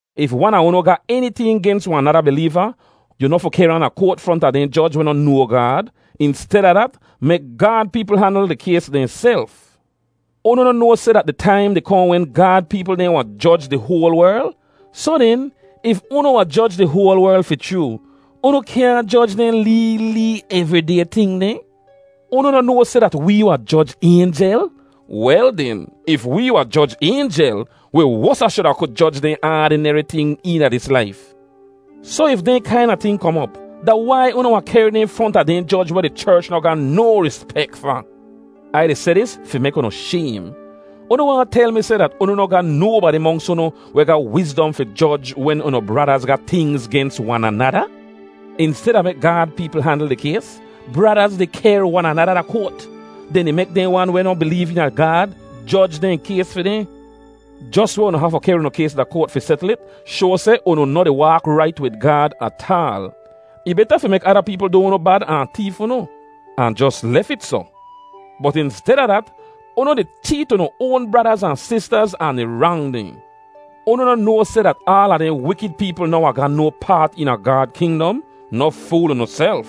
If wan a unu ga eniting gens wahn nada bileeva, yu noh fi kehr ahn da koat fronta dehn joj weh noh noa Gaad. Insteda dat, mek Gaad peepl handl di kays dehnself. Unu noh noa seh dat di taim di kohn wen Gaad peepl dehn wahn joj di hoal werl? Soh den, if unu wahn joj di hoal werl fi chroo, unu kyaahn joj dehn lee lee evriday ting dehn? Unu noh noa seh dat wee wahn joj aynjel? Wel den, if wee wahn joj aynjel, wi wosa shuda ku joj dehn aadineri ting eena dis laif! Soh if dehn kaina ting kom op, da wai unu wahn kehr dehn fronta dehn joj weh di cherch noh ga no rispek fa? Ai di seh dis fi mek unu shaym! Unu waahn tel mi seh dat unu noh ga nobadi monks unu weh ga wizdom fi joj wen unu bradaz ga tingz gens wan anada? Insteda mek Gaad peepl handl di kays, bradaz di kehr wan anada da koat. Dehn di mek dehn wan weh noh bileev eena Gaad joj dehn kays fi dehn! Jos weh unu hafu kehr unu kays da koat fi setl it shoa seh unu noh di waak rait wid Gaad ataal. Ih beta fi mek ada peepl du unu bad ahn teef unu, ahn jos lef it soh. Bot insteda dat, unu di cheet unu oan bradaz ahn sistaz ahn di rang dehn! Unu noh noa seh dat aala dehn wikid peepl noh wahn ga no paat eena Gaad kingdom? Noh fool unuself.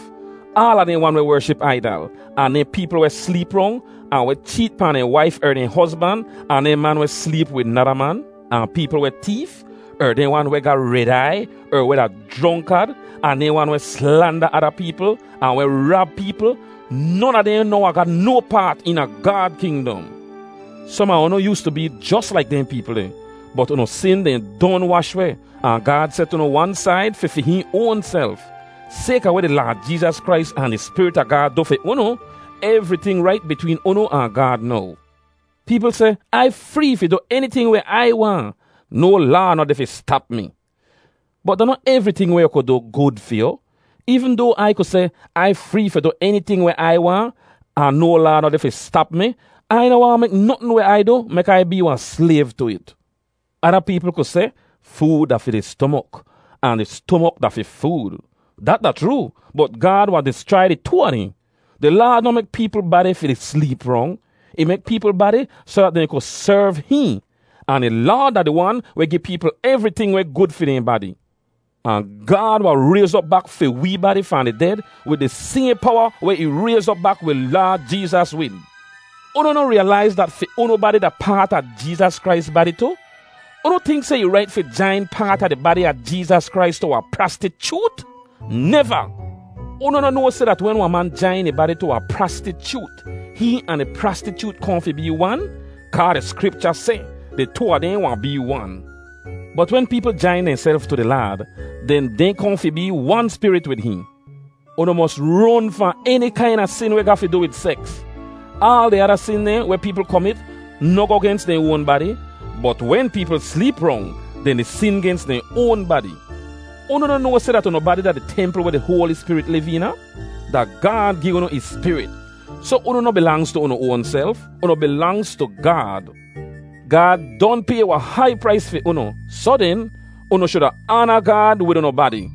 Aala dehn wan weh wership aidal, ahn dehn peepl weh sleep rong, ahn weh cheet pahn dehn waif er dehn hozban, ahn dehn man weh sleep wid nada man, ahn peepl weh teef, er dehn wan weh ga red aiy, er weh da jronkad, ahn dehn wan weh slanda ada peepl, ahn weh rab peepl—non a dehn noh wahn ga no paat eena Gaad kingdom. Som a unu yoostu bee jos laik dehn peepl deh. Bot unu sin dehn don wash weh, ahn Gaad set unu wan said fi fi hihn oanself. Sayka weh di Laad Jeezas Krais ahn di Spirit a Gaad du fi unu, evriting rait bitween unu ahn Gaad now. Peepl seh, “Ai free fi du eniting weh Ai waahn. No laa noh deh fi stap mi.” Bot da noh evriting weh yu ku du, gud fi yu. Eevn doa Ai ku seh, “Ai free fi du eniting weh Ai waahn, ahn no laa noh deh fi stap mi,” Ai noh waahn mek notn weh Ai du mek Ai bee wahn slayv tu it. Ada peepl ku seh, “Food da fi di stomok, ahn di stomok da fi food.” Dat da chroo, bot Gaad wahn dischrai di too a dehn. Di Laad noh mek peepl badi fi di sleep rong. Ih mek peepl badi soh dat dehn ku serv hihn. Ahn di Laad da di Wan weh gi peepl evriting weh gud fi dehn badi. Ahn Gaad wahn rayz op bak fi wee badi fahn di ded wid di sayhn powa weh ih rayz op bak wi Laad Jeezas wid. Unu noh riyalaiz dat fi unu badi da paat a Jeezas Krais badi tu? Unu tink seh ih rait fi jain paat a di badi a Jeezas Krais tu wahn prastichoot? Neva! Unu noh noa seh dat wen wahn man jain ih badi tu wahn prastichoot, hihn ahn di prastichoot kohn fi bee wan? Kaa di Skripcha seh, “Di too a dehn wahn bee wan.” Bot wen peepl jain dehnself tu di Laad, den dehn kohn fi bee wan spirit wid hihn. Unu mos ron fahn eni kaina sin weh ga fi du wid seks. Aal di ada sin dehn weh peepl komit noh goh gens dehn oan badi. Bot wen peepl sleep rong, dehn di sin gens dehn oan badi. Unu noh noa seh dat unu badi da di templ weh di Hoali Spirit liv eena? Da Gaad gi unu ih Spirit, soh unu noh bilangz tu unu oanself. Unu bilangz tu Gaad. Gaad don pay wahn hai prais fi unu. Soh den, unu shuda aana Gaad wid unu badi.